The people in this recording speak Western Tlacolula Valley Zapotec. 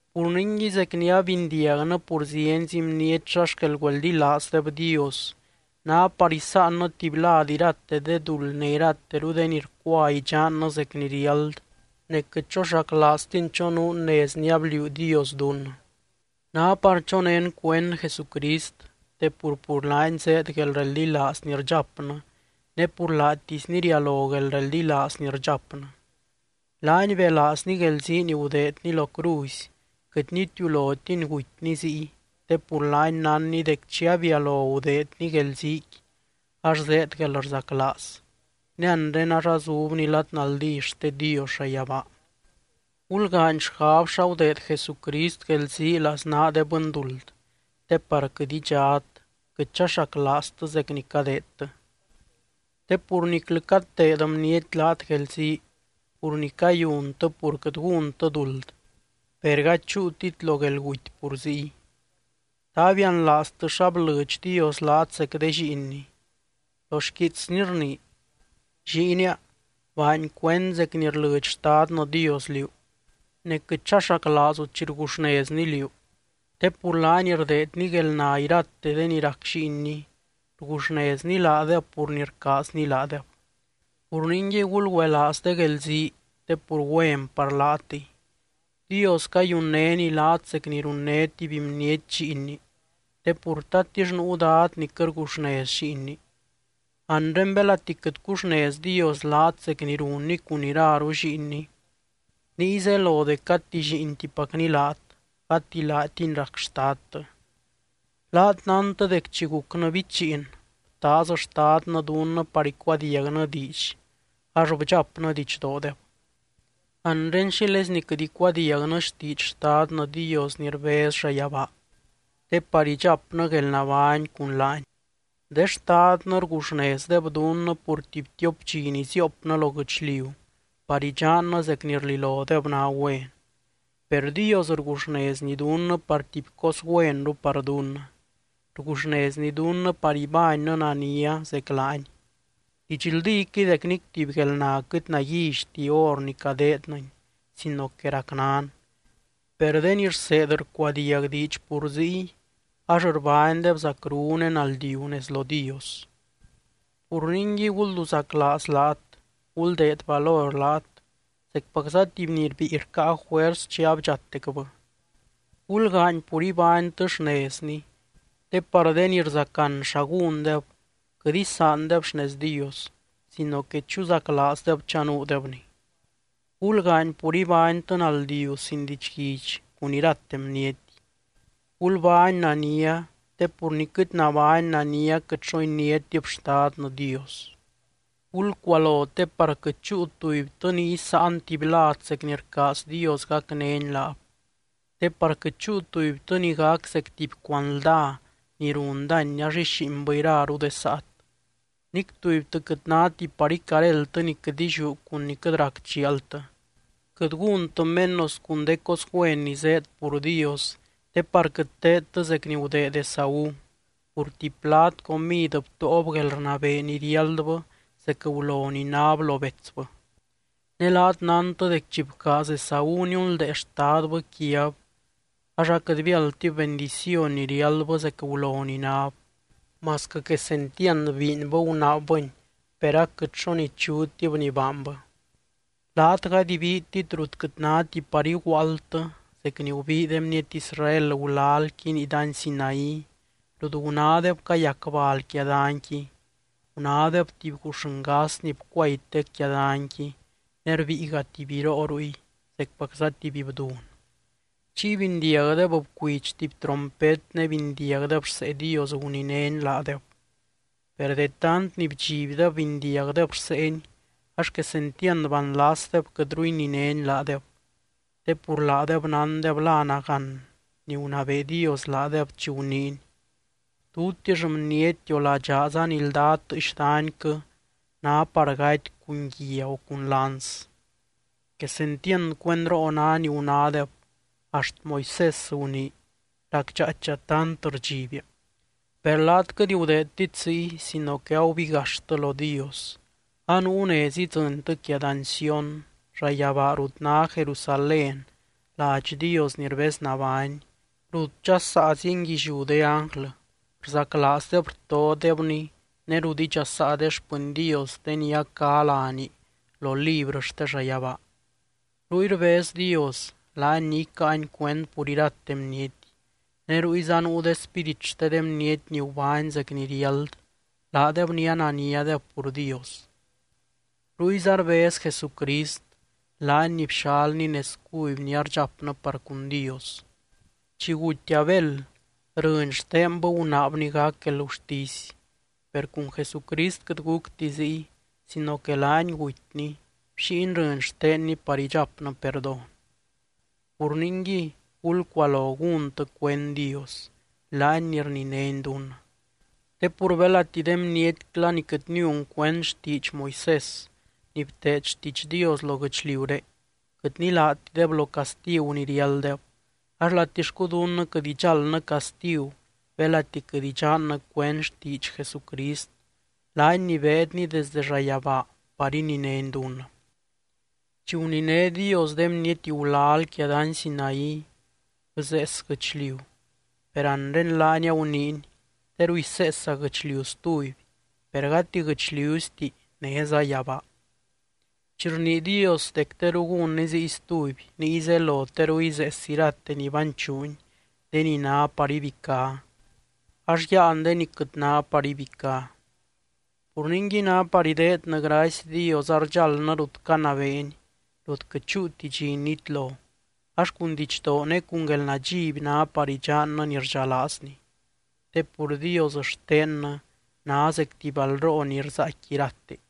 Pur ningui, zec ni abindiagnɨ pur zienzi bniety xa xquel güeldilaazdeb Dios, ná par isáannɨ tuby lad irate de duld ne irateru de ni rcua idxannɨ zec ni riáld, ne quɨt choxaclaaztin chonuun nez ni abliuu Dios dunnɨ. Ná par chonén cuend Jesucrist, te pur, pur laany zéed guelreldilaaz ni rdxapnɨ ne pur laatisny rialo guelreldilaaz ni rdxapnɨ. Laany belaazny guelzii ni gudeedny lo cruzy, quɨt nitiulotiny gutyny ziy te pur laany nánny dec chi abialo gudeedny guelziiqui, ax zéed guelrzaclaaz. Ne anre ax azubny lad naldí xte Dios llayabaa. Gulgaany xgab xa gudeed Jesucrist guelzii laznaa de bɨnduld te par quɨt idxat, quɨt chaxaclaaztɨ zec ni cadeedtɨ. Te pur niclɨ cateed bniety laat guelzii pur ni cayuntɨ pur quɨt gúntɨ duld, per gady chúutit lo guelguty pur ziy. ¿Ta abianlaaztɨ xa blɨdx Dios laat zec de lliinny? Lo xquiitsny rnii: Lliinia, baany cuend zec ni rlɨdx Xtadnɨ Dios liú, ne quɨt chaxaclaazu chi rguxnezny liú. Te pur laany rdeedny guelna irate de ni rac lliinny, rguxnezny laadeb pur ni rcaazny laadeb. Pur ningui, gulgüelaaz de guelzii, te pur güen par laatɨy. Dios cayunnény laat zec ni runné tuby bniety lliinni te pur, ¿tatix nuu dad ni quɨt rguxnez lliinni? Anre belati quɨt cuxnez Dios laat zec ni runny cun iraru lliinny, niy zelo dec gati lliintipacny laat, gati laatiny rac xtadtɨ. Laat nántɨ dec chi gucnɨ bichiin, btaaz xtadnɨ dunnɨ par icuadiagnɨ diidx ax bdxapnɨ didxdoodeb. Anre, ¿xílezni quɨt icuadiagnɨ xtiidx Xtadnɨ Dios ni rbez llayabaa, te par idxapnɨ guelnabány cun laany? De xtadnɨ rguxnezdeb dunnɨ pur tuby tiop dxi ni ziopnɨ lo guɨchliu par idxannɨ zec ni rlilodeb ná güen. Per Dios rguxnezny dunnɨ par tuby cos güenru par dunnɨ, rguxnezny dunnɨ par ibánnɨ nania zec laany. Didxldíquɨy dec nic tuby guelna quɨt naguillyti hor ni cadeednɨni sino que racnan. Per de ni rseed rcuadiag diidx pur ziy, ax rbánydeb zacru ne naldiu nez lo Dios. Pur ningui, gulduzaclaaz laat, guldeed valor laat zecpacza tuby ni rbíi rcáa juers chi abdxatecbɨ. Gulgaany pur ibánytɨ xnezni, te par de ni rzacan xa gúndeb, quɨt isaandeb xnez Dios sino que chuzaclaazdeb chanuudebni. Gulgaany pur ibánytɨ naldiu sin didxguidx cun irate bniety, gulbány nania te pur ni quɨt nabány nania quɨt xo iniátib Xtadnɨ Dios. Gulcualo te par quɨt chúu tubytɨ ni isáan tuby lad zec ni rcaaz Dios gacnény laab, te par quɨt chúu tubytɨ ni gac zec tuby cuanldá ni run dány ax íxiinbɨ iraru de saat. Nic tubytɨ quɨt náti par icaréldtɨ ni quɨt illiú cun ni quɨt rac chialtɨ, quɨt gúntɨ menos cun de cos güen ni zéed pur Dios te par quɨt teedtɨ zec ni gudeed Esaú, pur tuby plad comid btóob guelrnabee ni riáldbɨ zec gulo ni náb lo betsbɨ. Ne laat nántɨ dec chi bcaaz Esaú niunldee xtadbɨ quiab, ax aquɨt biáldtib bendiciony ni riáldbɨ zec gulo ni náb. Masquɨ quesentiand biinbɨ gunaabbɨni, per aquɨt xo nichutib ni baanbɨ. Laat gady ibiitit rut quɨt náti par iguaaldtɨ zec ni gubii de bniety Israel gulalqui nii dany Sinaí rut gunádeb cayac bal quia danqui, gunádeb tuby guuxngas ni bcuaytec quia danyqui ne rbíiga tuby biroo ruy zecpacza tuby bdun. Chiy bindiagdeb bcuidx tuby trompet ne bindiagdeb rsee Dios guninény laadeb. Per de tant ni bdxibdeb bindiagdeb rseeny ax quesentiand banlasdeb quɨtru ininény laadeb. Te pur laadeb nándeb la nagán ni gunabee Dios laadeb chi guniiny: “Tutix bniety o ladxaaza ni lda tɨɨx danyquɨ ná par gaty cun guia o cun lanz.” Quesentiand cuendroo ná ni gunádeb axt Moisés gunii: “Racdxaaicha tant rdxibia.” Per laat quɨt gudeedtit ziy sino que agubigaxtɨ lo Dios. Anuu nez idzɨntɨ quia dany Sión, llayabaa rut ná Jerusalén ladx Dios ni rbeznabány, rut dxasaa zienguilliú de ánglɨ rzaclaazdeb rtodebny ne rut idxasaa de xpɨny Dios de ni a cá láni lo librɨ xte llayabaa. Ruy rbez Dios, laany ni icáany cuend pur irate bniety, ne ruyza nuu de spírit xte de bniety ni gubány zec ni riáld laadeb ni ananiadeb pur Dios. Ruyza rbez Jesucrist, laany ni bxalny nez cuby ni ardxapnɨ par cun Dios. Chi guty Abel rɨny xtenbɨ gunaabni gac guelgurtisy, per cun Jesucrist quɨt gucti ziy sino que laany gutyny, bxíiny rɨny xtenny par idxapnɨ perdón. Pur ningui, gulcualo gúntɨ cuend Dios, laany ni rninény dunnɨ. Te pur belati de bnietcla ni quɨt niun cuend xtiidx Moisés ni bteed xtiidx Dios lo guɨchliuré quɨt nilátideb lo castigu ni riálddeb, ax latixcu dunnɨ quɨt idxáldnɨ castigu belati quɨt idxannɨ cuend xtiidx Jesucrist, laany ni beedny desde llayabaa par ininény dunnɨ. Chi guniné Dios de bniety gulal quia dany Sinaí, bzees guɨchliu. Per anre laany aguniiny: “Teru iseesa guɨchliu stuby, per gati guɨchliuzti néza yabaa.” Chi rnii Dios dec teru gúnny ziy stuby, niy zelo teru izees irate ni banchuuny, de ni ná par ibicá, ax yáan de ni quɨt ná par ibicá. Pur ningui, ná par ideednɨ gracy Dios ardxaldnɨ rut canabeeny, rut quɨt chúuti dxi nitlo, ax cun didxdoo ne cun guelnadxiby ná par idxannɨ ni rdxalaazny. Te pur Dios xtennɨ ná zec tuby balroo ni rzaaicqui irate.